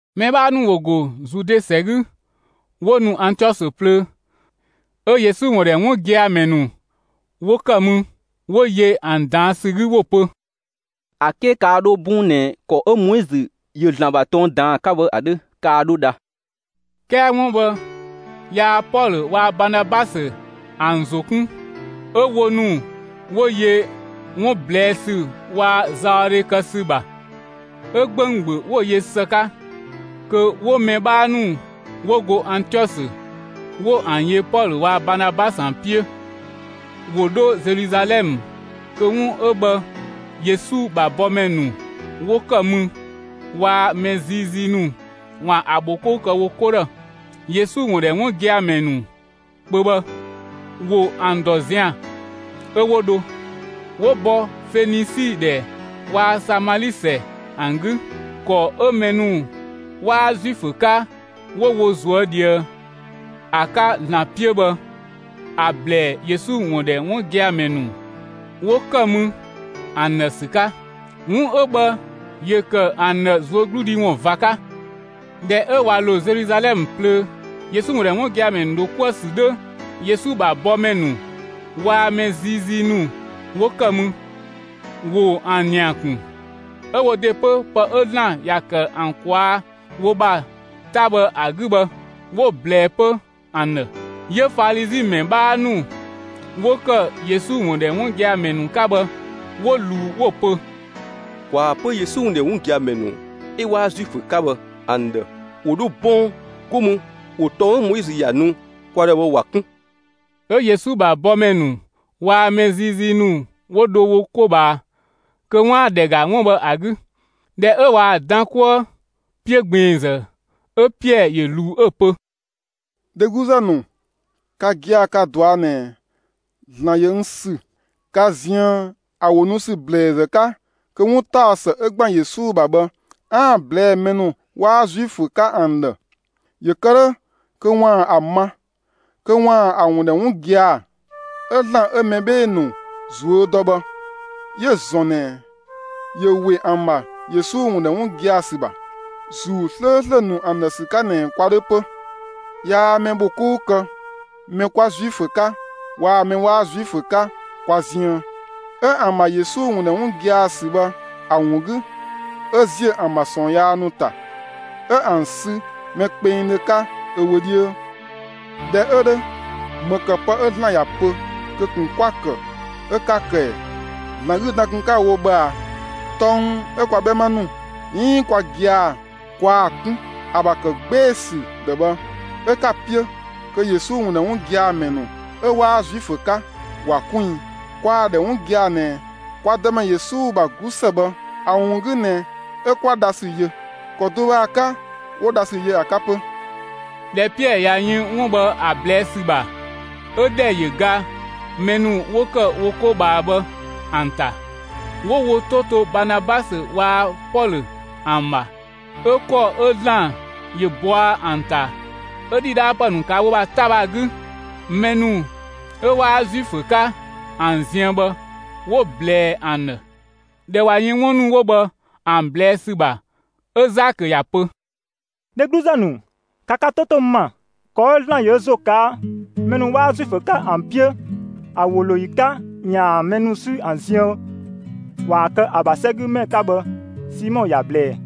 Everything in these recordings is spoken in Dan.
Mɛ 'bhaa ‑nu ‑wo ‑go Zude ‑sɛ 'gü 'wo nu Antiɔsö plöö, 'ö Yesu ‑wun ‑dhɛ 'wun gia‑ ‑mɛ ‑nu 'wo ‑kë mü, 'wo yö ‑an ꞊daan' ‑sü 'gü, 'wo‑ pö: «‑A 'ke kaa 'dho 'bɔng ꞊nɛ ‑kɔ 'ö Moizö ‑yö ‑Zlan ‑bha tɔng ꞊daan ‑a 'ka bhë ‑a 'dhö, kaa 'dho dha.» 'Kɛɛ 'wun bhë yaa Pɔlö waa‑ Baanabasö ‑an ‑zo 'kun; 'ö wo ‑nu 'wo yö 'wun ꞊blɛɛ' ‑sü waa‑ zaɔdhe kë ‑sü ‑bha. 'Ö 'gbɛɛdhö 'wo‑ yö ‑së 'ka kö 'wo mɛ 'bhaa ‑nu 'wo go Antiɔsö 'wo ‑an yö Pɔlö waa‑ Baanabasö ‑an 'piö, ‑wo 'dho Zeluzalɛmë kö 'wun 'ö bhë Yesu ‑bha bɔmɛ ‑nu 'wo ‑kë mü waa‑ mɛ ziizii ‑nu ‑waan ‑a ‑bhokou kë wo 'ko ‑dhë. Yesu ‑wun ‑dhɛ 'wun gia‑ ‑mɛ ‑nu kpö bhë, ‑wo ‑an ‑dɔ zian, 'ö 'wo dho. 'Wo bɔ Fenisi ‑dhɛ waa‑ Samali ‑sɛ ‑an 'gü, ‑kɔ 'ö mɛ ‑nu 'waa Zuifö 'ka 'wo wo ꞊zuö' ꞊dhië ‑a 'ka ‑Zlan 'piö bhë ‑a ꞊blɛɛ'‑ Yesu ‑wun ‑dhɛ 'wun gia‑ ‑mɛ ‑nu 'wo ‑kë mü ‑an ‑dhë ‑sü 'ka. 'Wun 'ö bhë ‑yö ‑kë ‑an ‑dhë ꞊zuögludhi ‑wun ꞊va 'ka. ꞊Dhɛ 'ö ꞊wa ‑lo Zeluzalɛmë plöö, Yesu ‑wun ‑dhɛ 'wun gia‑ ‑mɛ ‑nu ‑dho 'kuë‑ ‑sü 'dhö, Yesu ‑bha bɔmɛ ‑nu waa‑ mɛ ziizii ‑nu 'wo ‑kë mü, ‑wo ‑an ‑nia ‑kun. 'Ö wo ‑de 'pö, 'ö pë 'ö ‑Zlan ‑ya ‑kë ‑an ꞊kwaa' wo ‑bha 'ta bhë ‑a 'gü bhë, 'wo‑ ꞊blɛɛ 'pö ‑an ‑dhë. 'Yö Falizi ‑mɛ 'bhaa ‑nu 'wo ‑kë Yesu ‑wun ‑dhɛ 'wun gia‑ ‑mɛ ‑nu 'ka bhë 'wo ꞊luu, 'wo‑ pö: «‑Kwaa pö Yesu ‑wun ‑dhɛ 'wun gia‑ ‑mɛ ‑nu 'ö 'waa Zuifö 'ka bhë ‑an ‑dhë ‑wo 'dho 'bɔng, 'go mü ‑wo tɔng 'ö Moizö ‑ya nu kwa ‑dhë bhë ‑wa 'kun.» 'Ö Yesu ‑bha bɔmɛ ‑nu waa‑ mɛ ziizii ‑nu 'wo dho wo 'ko ꞊bhaa kö 'waan‑ ‑dhɛ ‑ga 'wun 'ö bhë ‑a 'gü. ꞊Dhɛ 'ö ꞊waa‑ dan 'kuë 'piö ꞊gbiinzë, 'ö Piɛɛ ‑yö ꞊luu 'ö‑ pö: «Dhegluzë ‑nu, ka gia‑ ka‑ ꞊dɔa' ꞊nɛ ‑Zlan ‑yö n ‑sü ka ziën ‑a ‑wo nu ‑sü ‑blɛɛzë 'ka kö 'wuntaɔsë 'ö ‑gban Yesu ‑bha bhë 'aan‑ ꞊blɛɛ'‑ mɛ ‑nu 'waa Zuifö 'ka ‑an ‑dhë; ‑yö kë 'dhö kö ‑waan ‑a ma, kö ‑waan ‑a ‑wun ‑dhɛ 'wun gia‑. 'Ö ‑Zlan 'ö mɛ 'bhee‑ ‑nu ꞊zuö' dɔ bhë 'yö‑ ‑zɔn ꞊nɛ ‑yö ‑we ‑an ‑bha Yesu ‑wun ‑dhɛ 'wun gia‑ ‑sü ‑bha, ‑Zuu 'slööslö ‑nu ‑an ‑dhë ‑sü 'ka ꞊nɛ kwa 'dhö 'pö. Yaa mɛ bho 'kou kë mɛ 'kwa Zuifö 'ka waa‑ mɛ 'waa Zuifö 'ka kwa ziën. 'Ö ‑an ‑bha Yesu ‑wun ‑dhɛ 'wun gia‑ ‑sü bhë ‑a ‑wun 'gü 'ö ‑ziö ‑an ‑bha ꞊sɔɔn yaa ‑nu ‑ta, 'ö ‑an sü mɛ kpengdhö 'ka ö wö 'dhiö. ꞊Dhɛ 'ö 'dhö, ‑më ‑kë pë 'ö ‑Zlan ‑ya pö kö ꞊kun 'kwa‑ ‑kë 'ö 'ka‑ ‑kë ‑ɛ? ‑Zlan 'gü dan kun 'ka‑ wo bhë ꞊a? Tɔng 'ö kwa 'bhɛma ‑nu 'iin kwa gia‑ kwaa‑ 'kun, ‑a ‑bha ‑kë 'gbee‑ ‑sü ‑dhë bhë 'ö 'ka‑ 'piö kö Yesu ‑wun ‑dhɛ 'wun gia‑ ‑mɛ ‑nu 'ö 'waa Zuifö 'ka, ‑wa kun i? Kwaa‑ ‑dhɛ 'wun gia‑ ꞊nɛ kwa Dëmɛ Yesu ‑bha 'glusë bhë ‑a ‑wun 'gü ꞊nɛ 'ö 'kwa dhasü yö. ‑Kɔ do bhë ‑a 'ka 'wo dhasü yö ‑a 'ka 'pö.» ꞊Dhɛ Piɛɛ ꞊ya yën 'wun bhë ‑a ꞊blɛɛ' ‑sü ‑bha, 'ö ‑dhɛ ‑yö ga mɛ ‑nu 'wo ‑kë wo 'ko ꞊bhaa bhë ‑an ‑ta. 'Wo wo 'to to Baanabasö waa‑ Pɔlö ‑an ‑bha, 'ö ‑kɔ 'ö ‑Zlan ‑yö bɔa ‑an ‑ta 'ö ‑dhidhaapë ‑nu ꞊kaa' wo ‑bha 'ta bhë ‑a 'gü, mɛ ‑nu 'ö 'waa Zuifö 'ka ‑an ziën bhë, 'wo‑ ꞊blɛɛ ‑an ‑dhë. ꞊Dhɛ ꞊wa yën 'wun ‑nu 'wo bhë ‑an ꞊blɛɛ' ‑sü ‑bha, 'ö Zakö ‑ya pö: «Dhegluzë ‑nu, ‑ka ka 'to 'to n ‑ma! ‑Kɔ 'ö ‑Zlan ‑yö ö ‑zo ꞊kaa' mɛ ‑nu 'waa Zuifö 'ka ‑an 'piö ‑a ‑wo ‑lo ‑yi 'ka kö 'yaan‑ mɛ ‑nu 'sü ‑an ziën, ‑waan kë ö ‑bha 'sɛgümɛ ‑nu 'ka bhë, Simɔ ‑ya ꞊blɛɛ.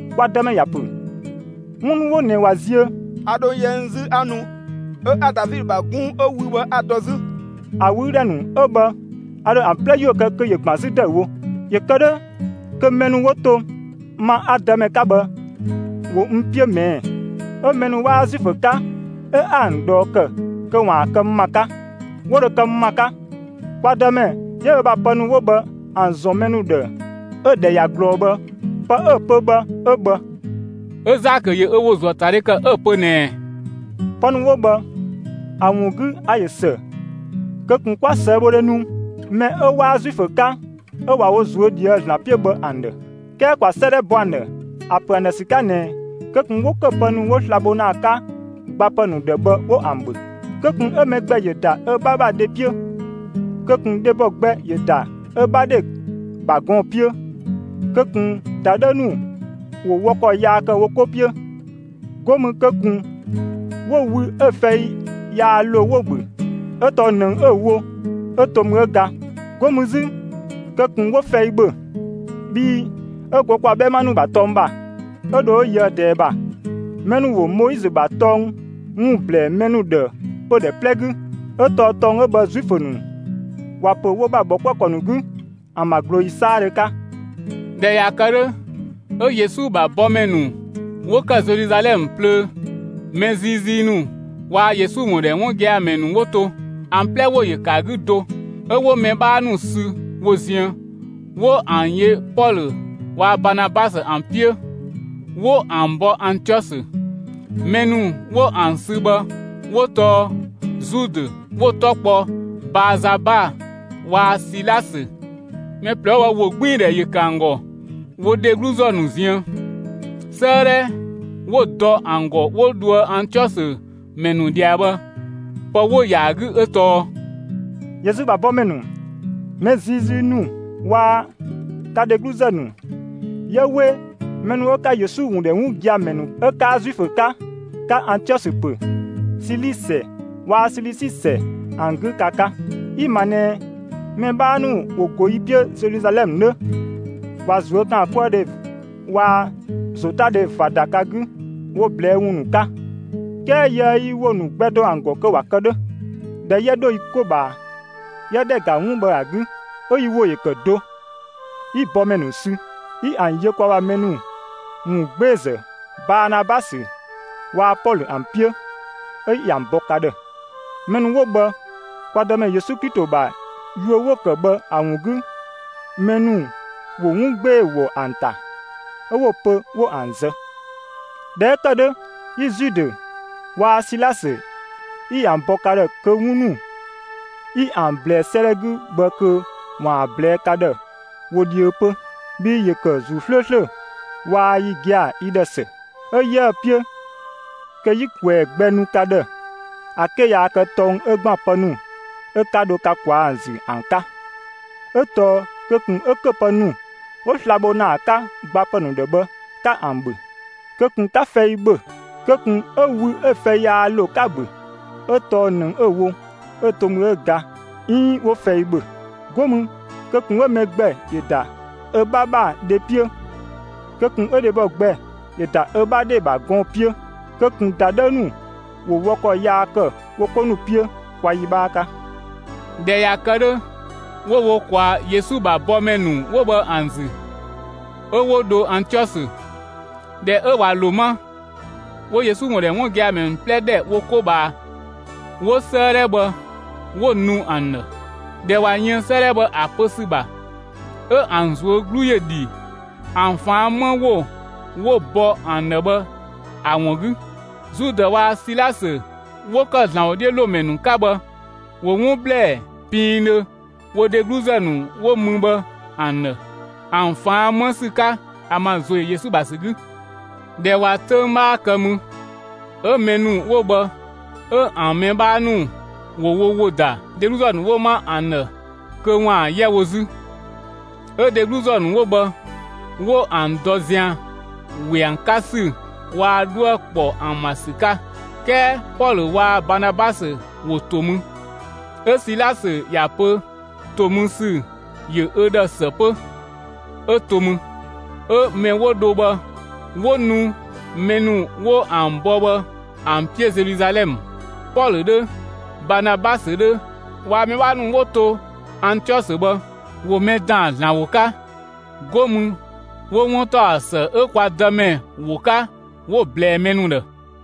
Kwa Dëmɛ ‑ya ‑pö: 'Wun ‑nu 'wo ꞊nɛ ꞊wa ziö, a ‑dho yɛ n 'zü 'a nu. 'Ö 'a Davidö ‑bha 'gunng 'ö wü bhë 'a‑ dɔ 'zü. ‑A ꞊wüü' ‑dhɛ ‑nu 'wo bhë a ‑dho ‑an 'plɛ ‑yuö kë kö ‑yö ‑gban 'zü ‑dëüwo. ‑Yö kë 'dhö kö mɛ ‑nu 'wo to, ma 'a‑ Dëmɛ 'ka bhë ‑wo n 'piö ꞊mɛɛ'; 'ö mɛ ‑nu 'waa Zuifö 'ka 'ö 'a ‑an ꞊dhɔɔ ‑kë kö ‑waan kë n ‑ma 'ka, 'wo dho kë n ‑ma 'ka. Kwa Dëmɛ 'yö ö ‑bha pë ‑nu 'wo bhë ‑an ‑zɔn mɛ ‑nu ‑dhë 'ö‑ ‑dhɛ ꞊ya ꞊glɔɔ bhë, pë 'ö‑ pö bhë 'ö bhë.» 'Ö Zakö ‑yö ö ‑wo ‑zuö ‑a ‑ta dhe ‑kë 'ö‑ pö ꞊nɛɛ: «Pë ‑nu 'wo bhë ‑a ‑wun 'gü, a‑ ‑yö ‑së kö ꞊kun 'kwa ꞊sëëbhodhe nu mɛ 'ö 'waa Zuifö 'ka 'ö ꞊wa wo ꞊zuö' ꞊dhië'‑ ‑Zlan 'piö bhë ‑an ‑dhë! 'Kɛɛ ‑kwa 'sëëdhɛ bɔ ‑an ‑dhë ‑a ‑pö ‑an ‑dhë ‑sü 'ka ꞊nɛɛ kö ꞊kun 'wo ‑köpë ‑nu 'wo sla‑ bho ‑na ‑an 'ka gbapë ‑nu ‑dhë bhë 'wo ‑an ‑bhö! Kö ꞊kun 'ö mɛ gbɛ ‑yö ‑da ö 'bha ‑bha dhe 'piö; kö ꞊kun dhebɔ gbɛ ‑yö ‑da ö 'bha dhe ‑bha gɔɔn‑ 'piö, kö ꞊kun ‑dadhëü ‑nu ‑wo wɔ ‑kɔ yaa ‑kë wo 'ko 'piö! 'Go mü kö ꞊kun 'wo wü 'ö‑ fɛi yaa ‑lo 'wo‑ ‑bhö, 'ö tɔɔ ꞊nëng 'ö‑ wo 'ö to mü 'ö ga. 'Go mü 'zü kö ꞊kun 'wo fɛi ‑bhö! Bhii 'ö go kwa 'bhɛma ‑nu ‑bha 'töng ‑bha, 'ö dho 'ö yöë ꞊dɛɛ ‑bha, mɛ ‑nu ‑wo Moizö ‑bha tɔng ‑wun ‑blɛɛ mɛ ‑nu ‑dhë pödhɛ 'plɛ 'gü; 'ö tɔɔ tɔng 'ö bhë Zuifö ‑nu ‑wa ‑pö wo ‑bha ‑bhɔkuëkɔ ‑nu 'gü, ‑an ‑bha ꞊glooyi 'saadhö 'ka.» ꞊Dhɛ ꞊ya kë 'dhö, 'ö Yesu ‑bha bɔmɛ ‑nu 'wo ‑kë Zeluzalɛmë plöö, mɛ ziizii ‑nu waa‑ Yesu ‑wun ‑dhɛ 'wun gia‑ ‑mɛ ‑nu 'wo to, ‑an 'plɛ ‑wo ‑yö ‑kë ‑a 'gü do, 'ö 'wo mɛ 'bhaa ‑nu sü wo ziën, 'wo ‑an yö Pɔlö waa‑ Baanabasö ‑an 'piö, 'wo ‑an bɔ Antiɔsö. Mɛ ‑nu 'wo ‑an sü bhë 'wo tɔɔ Zudë 'wo‑ 'tɔ kpɔ Baazaba waa‑ Silasö. Mɛ ꞊plɛ 'wo bhë ‑wogbiindhɛ ‑yö ‑kë ‑an ‑gɔ wo dhegluzë ‑nu ziën. 'Sëëdhɛ 'wo‑ dɔ ‑an ‑gɔ 'wo dhoë Antiɔsö ‑mɛ ‑nu ꞊dhia bhë, pë 'wo‑ ‑yaa 'gü 'ö tɔɔ: «Yesu ‑bha bɔmɛ ‑nu, mɛ ziizii ‑nu waa‑ ka dhegluzë ‑nu, 'yië 'we mɛ ‑nu 'ö 'ka Yesu ‑wun ‑dhɛ 'wun gia‑ ‑mɛ ‑nu 'ö 'kaa Zuifö 'ka, 'ka Antiɔsö ‑pö, Sili ‑sɛ waa‑ Silisi ‑sɛ ‑an 'gü, ka 'ka! Yi‑ ‑ma ꞊nɛ mɛ 'bhaa ‑nu 'wo go yi 'piö Zeluzalɛmë 'nö, ꞊wa ꞊zuökaankuëdhe waa‑ ‑zotadhe ꞊va ‑da ka 'gü wo ꞊blɛɛ'‑ ‑wun ‑nu 'ka; 'kɛɛ yiëë yi ‑wo ‑nu gbɛ dɔ ‑an ‑gɔ kö ‑wa kë 'dhö. ꞊Dhɛ 'yië 'dho yi 'ko ꞊bhaa, 'yië ‑dhɛ ‑ga 'wun 'ö bhë ‑a 'gü, 'ö yi ‑wo ‑yö ‑kë do, 'yi bɔmɛ ‑nu sü, 'yi ‑an yö kwa ‑bha mɛ ‑nu ‑wun 'gbeezë Baanabasö waa‑ Pɔlö ‑an 'piö, 'ö 'yi ‑an bɔ ka ‑dhë. Mɛ ‑nu 'wo bhë kwa Dëmɛ Yesu Klito ‑bha yuö 'wo‑ ‑kë bhë ‑a ‑wun 'gü, mɛ ‑nu ‑wo 'wun 'gbee‑ ‑wɔ ‑an ‑ta, 'ö 'wo‑ pö 'wo ‑an zë. ꞊Dhɛ 'ö ‑kë 'dhö, 'yi Zudë waa‑ Silasö 'yi ‑an bɔ ka ‑dhë kö 'wun ‑nu 'yi ‑an ꞊blɛɛ 'sëëdhɛ 'gü bhë kö ‑waan ‑an ꞊blɛɛ'‑ ka ‑dhë wo dhiö 'pö. Bhii ‑yö ‑kë ‑Zuu 'slööslö waa‑ yi gia‑ yi ‑dhë ‑së, 'ö 'yiëë‑ 'piö kö 'yi ꞊kwɛɛ‑ gbɛ nu ka ‑dhë ‑a 'ke yaa kë tɔng 'ö ‑gban pë ‑nu 'ö 'ka dho ka ꞊kwaa'‑ ‑zü ‑an 'ka. 'Ö tɔɔ kö ꞊kun 'ö ‑köpë ‑nu 'wo sla‑ bho ‑na ‑an 'ka gbapë ‑nu ‑dhë bhë 'ka ‑an ‑bhö, kö ꞊kun 'ka fɛi ‑bhö! Kö ꞊kun 'ö wü 'ö‑ fɛi yaa ‑lo 'ka‑ ‑bhö, 'ö tɔɔ ꞊nëng 'ö‑ wo 'ö to mü 'ö ga 'iin 'wo fɛi ‑bhö. 'Go mü kö ꞊kun 'ö mɛ gbɛ ‑yö ‑da ö 'bha ‑bha dhe 'piö, kö ꞊kun dhebɔ gbɛ ‑yö ‑da ö 'bha dhe ‑bha gɔɔn‑ 'piö, kö ꞊kun ‑dadhëü ‑nu ‑wo wɔ ‑kɔ yaa ‑kë wo 'ko 'piö! ‑Kwa yi 'bhaa 'ka!» ꞊Dhɛ ꞊ya kë 'dhö, 'wo wo ꞊kwaa Yesu ‑bha bɔmɛ ‑nu 'wo bhë ‑an ‑zü, 'ö 'wo dho Antiɔsö. ꞊Dhɛ ö ꞊wa ‑lo 'ma, 'wo Yesu ‑wun ‑dhɛ 'wun gia‑ ‑mɛ ‑nu 'plɛ ‑dhɛ wo 'ko ꞊bhaa, 'wo 'sëëdhɛ bhë 'wo‑ nu ‑an ‑dhë. ꞊Dhɛ ꞊wa yën 'sëëdhɛ bhë ‑a pö ‑sü ‑bha, 'ö ‑an ꞊zuö' 'glu ‑yö ‑dhi ‑an ꞊faan' 'më ‑wo 'wo‑ bɔ ‑an ‑dhë bhë ‑a ‑wun 'gü. Zudë waa‑ Silasö 'wo ‑kë ‑Zlan ‑wodhiölomɛ ‑nu 'ka bhë ‑wo 'wun ‑blɛɛ piindhö wo dhegluzë ‑nu 'wo mü bhë ‑an ‑dhë, ‑an ꞊faan' 'më ‑sü 'ka ‑an ‑bha ‑zo ‑yö Yesu ‑bha ‑sü 'gü. ꞊Dhɛ ꞊wa 'töng 'bhaa kë mü, 'ö mɛ ‑nu 'wo bhë 'ö ‑an mɛ 'bhaa ‑nu ‑wo wo ‑wo ‑da dhegluzë ‑nu 'wo 'ma ‑an ‑dhë kö ‑waan 'yɛ wo 'zü. 'Ö dhegluzë ‑nu 'wo bhë, 'wo ‑an dɔ ‑zian ‑we ‑an 'ka ‑sü waa‑ 'dhuë‑ ‑kpɔ ‑an ‑bha ‑sü 'ka. 'Kɛɛ Pɔlö waa‑ Baanabasö ‑wo ‑to mü. ['Ö Silasö ‑ya pö ‑to mü ‑sü ‑yö ö ‑dhë ‑së 'pö; 'ö to mü. 'Ö mɛ 'wo dho bhë 'wo nu mɛ ‑nu 'wo ‑an bɔ bhë ‑an 'piö Zeluzalɛmë.] Pɔlö 'dhö, Baanabasö 'dhö waa‑ mɛ 'bhaa ‑nu 'wo ‑to Antiɔsö bhë, ‑wo mɛ ꞊daan ‑Zlan ‑wo 'ka. 'Go mü 'wo 'wuntaɔsë 'ö kwa Dëmɛ ‑wo 'ka 'wo‑ ꞊blɛɛ mɛ ‑nu ‑dhë.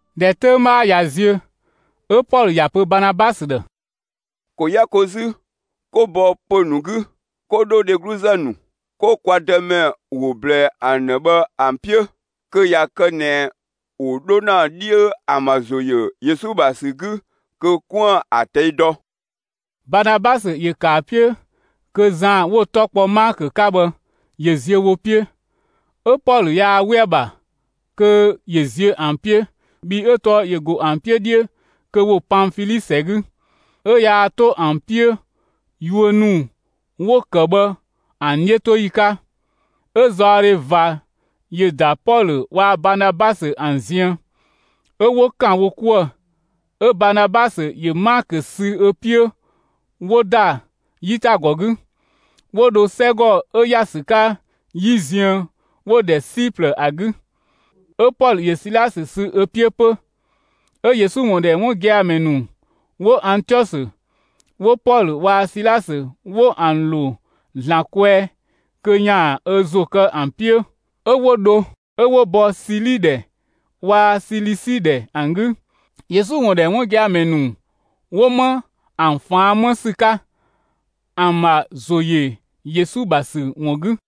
꞊Dhɛ 'töng 'bhaa ꞊ya ziö, 'ö Pɔlö ‑ya pö Baanabasö ‑dhë: «‑Ko 'yɛ ko 'zü, 'ko bɔ pö‑ ‑nu 'gü, 'ko 'dho dhegluzë ‑nu, 'ko kwa Dëmɛ ‑wo ꞊blɛɛ ‑an ‑dhë bhë ‑an 'piö! Kö ꞊ya kë ꞊nɛ ‑wo 'dho ‑na 'dhiö ‑an ‑bha ‑zo ‑yö Yesu ‑bha ‑sü 'gü, kö 'koën‑ ‑a ꞊tɛi' dɔ!» Baanabasö ‑yö ‑kë ‑a 'piö kö Zan 'wo‑ 'tɔ kpɔ Maakö 'ka bhë ‑yö ziö wo 'piö. 'Ö Pɔlö yaa 'we‑ ‑bha kö ‑yö ziö ‑an 'piö, bhii 'ö tɔɔ ‑yö ‑go ‑an 'piö 'dhiö kö ‑wo Panfili ‑sɛ 'gü, 'ö yaa 'to ‑an 'piö yuö ‑nu 'wo‑ ‑kë bhë ‑an 'dhiötoyi 'ka. 'Ö zaɔdhe ꞊va ‑yö ‑da Pɔlö waa‑ Baanabasö ‑an ziën, 'ö 'wo ‑kan wo 'kuë‑. 'Ö Baanabasö ‑yö Maakö sü ö 'piö, 'wo ‑da 'yitagɔ 'gü, 'wo dho 'sɛgɔ 'ö ‑ya ‑sü 'ka 'yi ziën 'wo‑ ‑dhɛ Siplë ‑a 'gü. 'Ö Pɔlö ‑yö Silasö sü ö 'piö 'pö. 'Ö Yesu ‑wun ‑dhɛ 'wun gia‑ ‑mɛ ‑nu 'wo Antiɔsö, 'wo Pɔlö waa‑ Silasö 'wo ‑an ‑lo ‑Zlan kwɛɛ kö ‑yaan ö ‑zo kë ‑an 'piö, 'ö 'wo dho. 'Ö 'wo bɔ Sili ‑dhɛ waa‑ Silisi ‑dhɛ ‑an 'gü, Yesu ‑wun ‑dhɛ 'wun gia‑ ‑mɛ ‑nu 'wo 'ma ‑an ꞊faan' 'më ‑sü 'ka, ‑an ‑bha ‑zo ‑yö Yesu ‑bha ‑sü ‑wun 'gü.